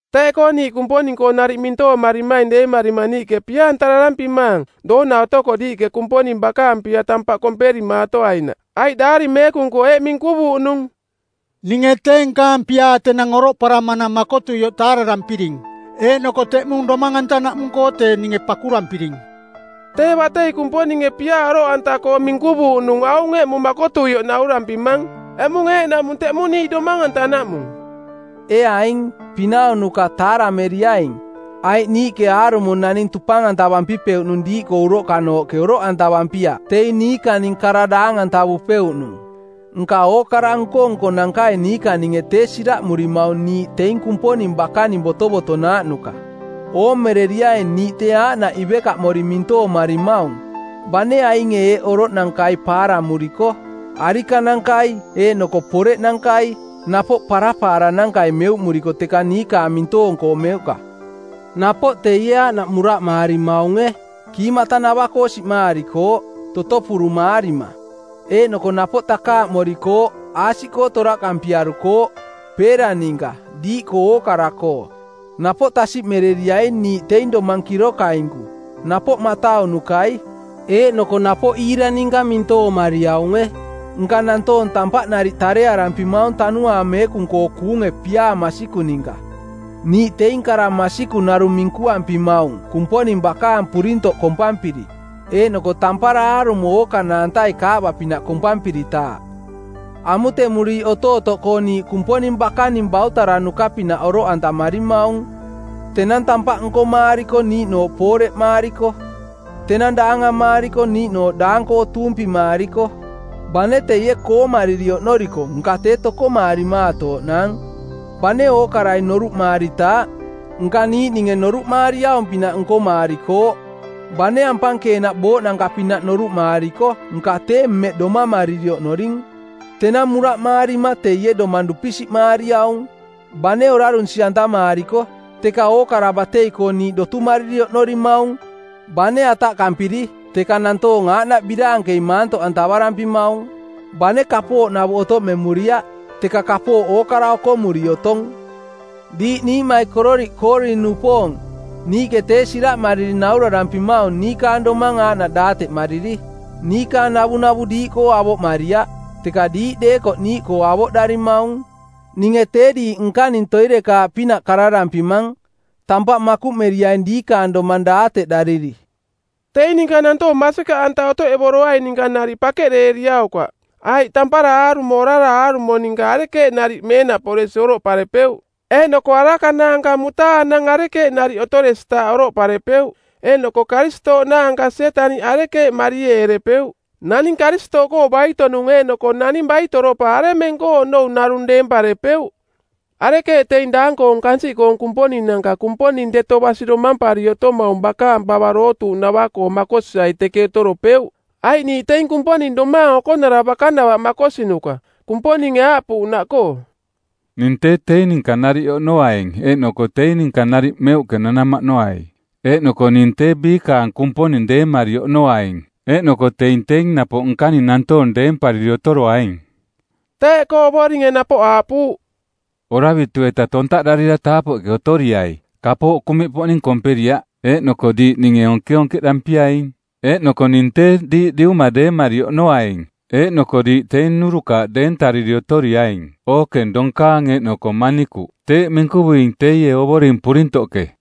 Teeꞌkoo niiꞌ Kumponing-koo nariꞌ mintoomarimaing deemarima niiꞌke pia-antararampimaang doona otoko diiꞌke Kumponing bakaang piaa tampaꞌ komperimaatoainaꞌ. Aiꞌ Daari Meekung-koo eeꞌ minkuvuuꞌnung, “Ninge tee nkaang piaa tenang oroꞌparamanang makotuioꞌ taararampiring, eeꞌnoko teꞌmung domang-antanaꞌmung-koo tee ninge pakurampiring.” Tee batei Kumponinge piaa oroꞌanta-koo minkuvuuꞌnung aung eꞌmung makotuioꞌ naurampimang. Eꞌmung eeꞌnaꞌmung teꞌmung niiꞌ domang-antanaꞌmung. Ee aing, pinaunuka taarameriaing, aiꞌ niiꞌke aarumo naning tupang-antavampipeuꞌnung diiꞌkoo uroꞌkanooꞌke oroꞌantavampiaꞌ teing niikaning kara daang-antavupeuꞌnung. Nka ookara nko-nkonankai niikaninge tee siraꞌmurimaung niiꞌ teing Kumponing bakaning botovotonaaꞌnuka. Oomereriaing niiꞌ tee aaꞌnaꞌ ivekaꞌmori mintoomarimaung, bane ainge eeꞌoroꞌnankai paaramuriko: arikanankai eeꞌnoko poreꞌnankai, napoꞌ papaaranankai meuꞌmuriko teka niikaang mintoong-koo meuꞌka. Napoꞌ teie aaꞌnaꞌ muraꞌmaarimaunge, kiimatanava-koo siꞌmaarikooꞌ, totopurumaarima˜. Eeꞌnoko napoꞌ takaaꞌmorikooꞌ, aasiꞌkoo toraꞌkampiarukooꞌ, peera ninka, diiꞌkoo ookara-koo. Napoꞌ tasiꞌmereriai niiꞌ teing domang kirokainku, napoꞌ mataunukai, eeꞌnoko napoꞌ iira ninka mintoomariaunge, nka nantoong tampaꞌ nariꞌ tarearampimaung Tanuaang Meekung-koo kuunge piaa masikung ninka. Niiꞌ teing kara masikung narung minkuampimaung Kumponing bakaang purintoꞌ kompampiri, eeꞌnoko tampara aarumo ookanaantai kaaꞌba-pinaꞌ kompampiritaaꞌ. Amutemuriiꞌ otootoꞌkoo niiꞌ Kumponing bakaning bautaranuka-pinaꞌ oroꞌantamarimaung: tenang tampaꞌ nkomaariko niiꞌnooꞌ pooreꞌmaariko, tenang daangamaariko niiꞌnooꞌ daang-koo tuumpimaariko. Bane teie koomariri oꞌnoriko nka tee tokomaarimaatooꞌnaang. Bane ookarai noruꞌmaaritaaꞌ, nka niiꞌninge noruꞌmaariaung-pinaꞌ nkomaarikooꞌ. Bane ampankeenaꞌ booꞌnanka-pinaꞌ noruꞌmaariko nka tee mmeꞌ domamariri oꞌnoring. Tenang muraꞌmaarima teie domang dupisiꞌmaariaung. Bane orarunsi-antamaarikooꞌ, teka ookara batei-koo niiꞌ dotumariri oꞌnorimaung. Bane ataꞌkampiri, teka nantoong aaꞌnaꞌ biraankei maantoꞌantavarampimaung. Bane kapooꞌnavuꞌ otoꞌmemuriaꞌ, teka kapooꞌ ookara okomuri otong. Diiꞌ niiꞌmaikororiꞌ Koorin-nupoong, niiꞌke tee siraꞌmariri naurarampimaung niikaang domang aaꞌnaꞌ daateꞌmariri. Niikaang navunavu diiꞌkoo avoꞌmariaꞌ, teka diiꞌ deekoꞌ niiꞌkoo avoꞌdarimaung. Ninge tee diiꞌ nkaning toirekaaꞌpinaꞌ kararampimang. Tampaꞌ makuꞌmeriaing diikaang domang daateꞌdariri. Teing ninka nantoong masikaꞌanta otoꞌevoroaing ninka nariꞌ pakeꞌdeeriaukaꞌ, aiꞌ tampara aarumo orara aarumo ninka arekeeꞌ nariꞌ meenaꞌporesi oroꞌparepeuꞌ? Eeꞌnoko araka naanka mutaanang arekeeꞌ nariꞌ otoresitaaꞌ oroꞌparepeuꞌ? Eeꞌnoko Karistooꞌ naanka Sietaniꞌ arekeeꞌ marieerepeuꞌ? Naning Karistooꞌkoo baito-nung eeꞌnoko naning baitoropa aremeng-koo onou narung deemparepeuꞌ? Arekeeꞌ teing daang-koong kansiꞌkoong kumponinanka Kumponing deto basi domampari otomaung bakaang pava dootuuꞌnava-koo makosiai teke otoropeuꞌ? Aiꞌ niiꞌ teing Kumponing domaang okonara bakanava makosinuka, Kumponinge aaꞌpuuꞌnaꞌkoo, “Ning tee teing ninka nariꞌ oꞌnoaing eeꞌnoko teing ninka nariꞌ meuꞌke nanamaꞌnoai, eeꞌnoko ning tee biikaang Kumponing deemari oꞌnoaing eeꞌnoko teing teing napoꞌ nkaning nantoong deempariri otoroaing.” Teeꞌkoo Ovoringe napoꞌ aaꞌpuuꞌ: “Oravitu-eta tontaꞌdarira taapoꞌke otoriai. Kapooꞌ kuꞌmiꞌpoꞌning komperiaꞌ eeꞌnoko diiꞌ ninge onkeonkeꞌdampiaing. Eeꞌnoko ning tee diiꞌ Diuma deemari oꞌnoaing eeꞌnoko diiꞌ teing nnurukaaꞌ deentariri otoriaing, ookeng donkaang eeꞌnoko manikuꞌ. Teeꞌ minkuvuing teie Ovoring Purintoꞌke.”